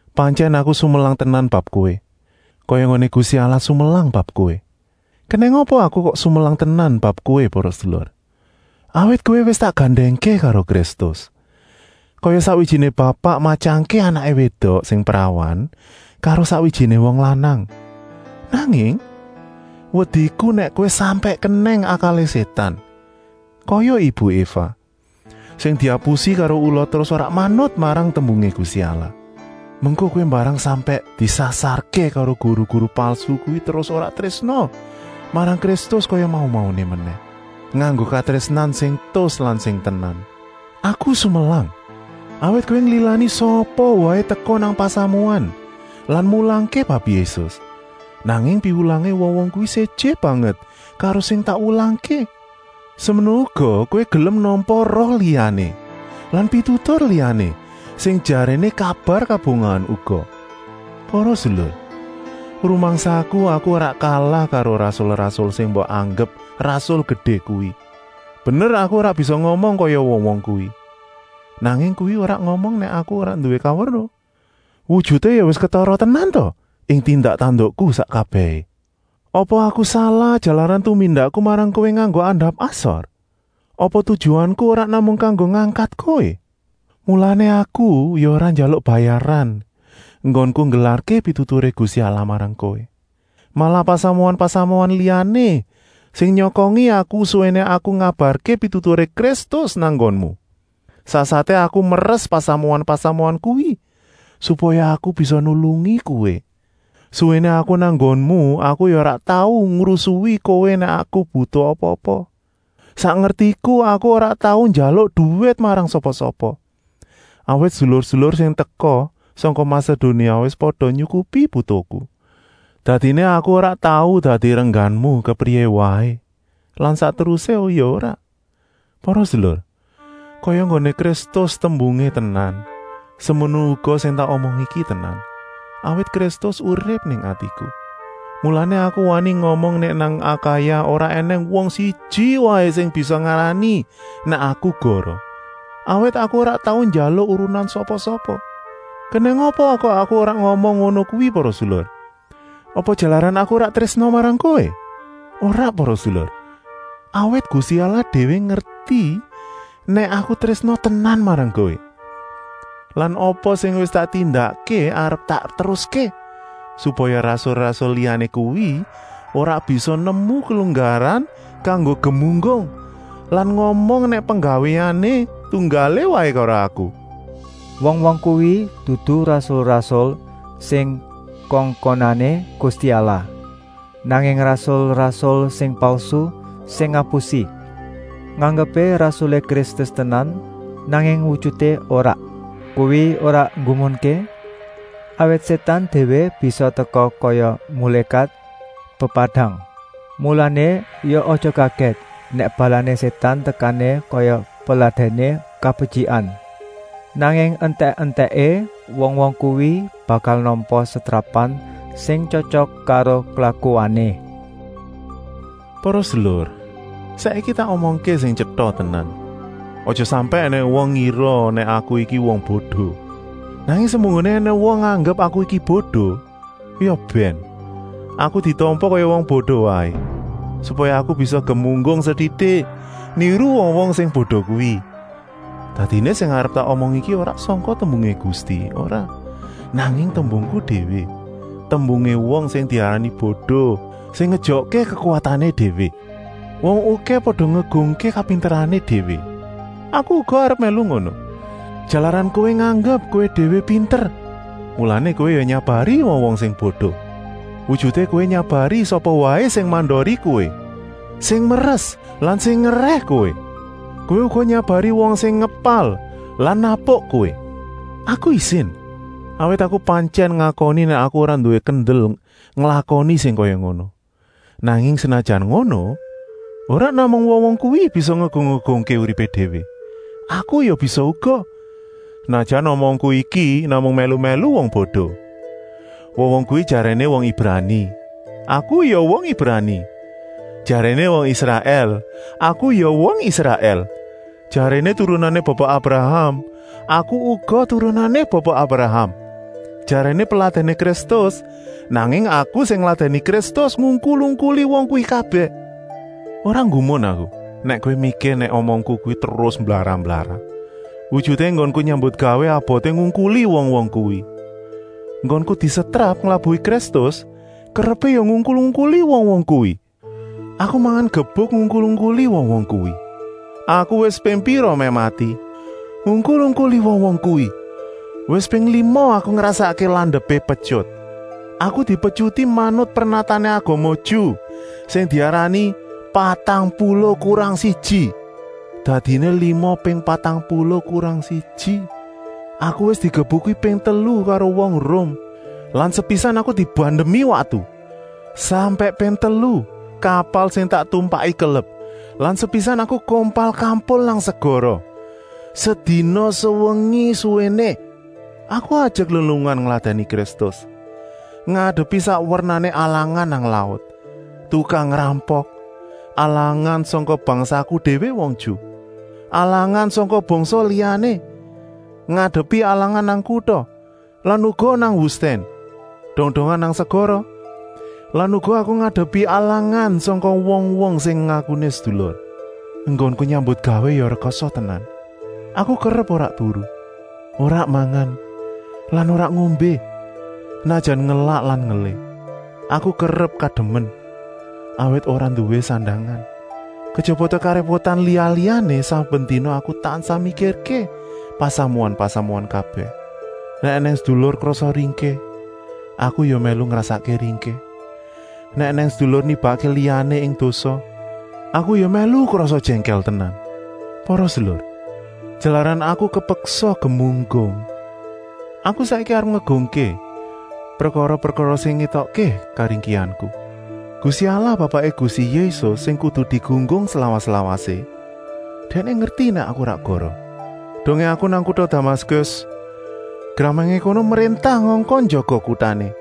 Pantyèn aku sumelang tenan bab kowé, kaya enggoné Gusti Allah sumelang bab kowé. Kenèng apa aku kok sumelang tenan bab kowé para sedulur? Awit kowé wis tak gandèngké karo Kristus, kaya sakwijiné bapak matyangké anaké wédok sing prawan karo sakwijiné wong lanang. Nanging, wediku nèk kowé sampèk kenèng akalé Sétan, kaya ibu Eva, sing diapusi karo ula terus ora manut marang tembungé Gusti Allah. Mengko kowé mbarang sampèk disasarké karo guru-guru palsu kuwi terus ora trésna marang Kristus kaya mau-mauné menèh, nganggo katrésnan sing tus lan sing tenan. Aku sumelang, awit kowé nglilani sapa waé teka nang pasamuan lan mulangké bab Yésus, nanging piwulangé wong-wong kuwi séjé banget karo sing tak wulangké. Semono uga kowé gelem nampa roh liyané lan pitutur liyané, sing jaréné kabar kabungahan uga. Para sedulur, rumangsaku aku ora kalah karo rasul-rasul sing mbok anggep rasul gedé kuwi. Bener aku ora bisa ngomong kaya wong-wong kuwi, nanging kuwi ora ngomong nèk aku ora nduwé kaweruh. Wujuté ya wis ketara tenan ta ing tindak-tandukku sak kabèhé. Apa aku salah jalaran tumindakku marang kowé nganggo andap-asor? Apa tujuanku ora namung kanggo ngangkat kowé? Mulané aku ya ora njaluk bayaran enggonku nggelarké pituturé Gusti Allah marang kowé. Malah pasamuan-pasamuan liyané sing nyokongi aku suwéné aku ngabarké pituturé Kristus nang nggonmu. Sasaté aku meres pasamuan-pasamuan kuwi, supaya aku bisa nulungi kowé. Suwéné aku nang nggonmu aku ya ora tau ngrusui kowé nèk aku butuh apa-apa. Sak ngertiku aku ora tau njaluk duwit marang sapa-sapa, awit sedulur-sedulur sing teka sangka Masedonia wis pada nyukupi butuhku. Dadiné aku ora tau dadi rengganmu kepriyé waé lan sak terusé ya ora. Para sedulur, kaya enggoné Kristus tembungé tenan, semono uga sing tak omong iki tenan, awit Kristus urip ing atiku. Mulané aku wani ngomong nèk nang Akaya ora ènèng wong siji waé sing bisa ngarani nèk aku goroh, awit aku ora tau njaluk urunan sapa-sapa. Kenèng apa aku kok ngomong ngono kuwi para sedulur? Apa jalaran aku ora trésna marang kowé? Ora para sedulur, awit Gusti Allah déwé ngerti nèk aku trésna tenan marang kowé. Lan apa sing wis tak tindakké arep tak teruské, supaya rasul-rasul liyané kuwi ora bisa nemu kelunggaran kanggo gemunggung lan ngomong nèk penggawéané tunggalé waé karo aku. Wong-wong kuwi dudu rasul-rasul sing kongkonané Gusti Allah, nanging rasul-rasul sing palsu, sing ngapusi. Nganggepé rasulé Kristus tenan, nanging wujuté ora. Kuwi ora nggumunké, awit Sétan déwé bisa teka kaya mulékat pepadang. Mulané ya aja kagèt nèk balané Sétan tekané kaya peladèné kabetyikan. Nanging entèk-entèké wong-wong kuwi bakal nampa setrapan sing tyotyok karo klakuané. Para sedulur, saiki tak omongké sing tyeta tenan: aja sampèk ènèng wong ngira nèk aku iki wong bodo. Nanging semunggoné ènèng wong nganggep aku iki bodo, ya bèn, aku ditampa kaya wong bodo waé, supaya aku bisa gemunggung setitik, niru wong-wong sing bodo kuwi. Dadiné sing arep tak omong iki ora sangka tembungé Gusti, ora, nanging tembungku déwé, tembungé wong sing diarani bodo, sing ngejokké kekuwatané déwé. Wong okèh pada ngegungké kapinterané déwé, aku uga arep mèlu ngono. Jalaran kowé nganggep kowé déwé pinter, mulané kowé ya nyabari wong-wong sing bodo. Wujuté kowé nyabari sapa waé sing mandori kowé, sing meres lan sing ngerèh kowé. Kowé uga nyabari wong sing ngepal lan napuk kowé. Aku isin, awit aku pantyèn ngakoni nèk aku ora nduwé kendel nglakoni sing kaya ngono. Nanging senajan ngono, ora namung wong-wong kuwi bisa ngegung-egungké uripé déwé. Aku ya bisa uga, senajan omongku iki namung mèlu-mèlu wong bodo. Wong-wong kuwi jaréné wong Ibrani, aku ya wong Ibrani. Jaréné wong Israèl, aku ya wong Israèl. Jaréné turunané Bapa Abraham, aku uga turunané Bapa Abraham. Jaréné peladèné Kristus, nanging aku sing ngladèni Kristus ngungkul-ungkuli wong kuwi kabèh. Ora nggumun aku nèk kowé mikir nèk omongku kuwi terus mblarah-mblarah. Wujuté enggonku nyambutgawé aboté ngungkuli wong-wong kuwi. Enggonku disetrap nglabuhi Kristus kerepé ya ngungkul-ungkuli wong-wong kuwi. Aku mangan gebuk ngungkul-ungkuli wong-wong kuwi. Aku wis ping pira mèh mati, ngungkul-ungkuli wong-wong kuwi. Wis ping lima aku ngrasakké landepé petyut. Aku dipetyuti manut pernatané agama Ju sing diarani “patang puluh kurang siji”. Dadiné lima ping patang puluh kurang siji. Aku wis digebuki ping telu karo wong Rum lan sepisan aku dibandemi watu. Sampèk ping telu kapal sing tak tumpaki kelep lan sepisan aku kompal-kampul nang segara, sedina-sewengi suwéné. Aku ajek lelungan ngladèni Kristus, ngadepi sak wernané alangan nang laut, tukang ngrampok, alangan sangka bangsaku déwé wong Ju, alangan sangka bangsa liyané, ngadepi alangan nang kuta lan uga nang wustèn, dong-dongan nang segara lan uga aku ngadepi alangan sangka wong-wong sing ngakuné sedulur. Enggonku nyambutgawé ya rekasa tenan. Aku kerep ora turu, ora mangan lan ora ngombé, senajan ngelak lan ngelih. Aku kerep kademen, awit ora nduwé sandangan. Kejaba karépotan liya-liyané, saben dina aku tansah mikirké pasamuan-pasamuan kabèh. Nèk ènèng sedulur krasa ringkih, aku ya mèlu ngrasakké ringkih, nèk ènèng sedulur nibakké liyané ing dosa, aku ya mèlu krasa jèngkèl tenan. Para sedulur, jalaran aku kepeksa gemunggung, aku saiki arep ngegungké prekara-prekara sing ngétokké karingkihanku. Gusti Allah Bapaké Gusti Yésus sing kudu digunggung slawas-lawasé, Dèkné ngerti nèk aku ora goroh. Dongé aku nang kuta Damaskus, gramangé kono mréntah ngongkon njaga kutané,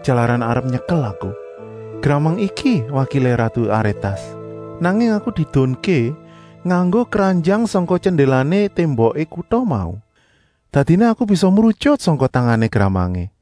jalaran arep nyekel aku. Gramang iki wakilé ratu Arétas. Nanging aku diedunké nganggo kranjang sangka jendélané témboké kuta mau. Dadiné aku bisa mrutyut sangka tangané gramangé.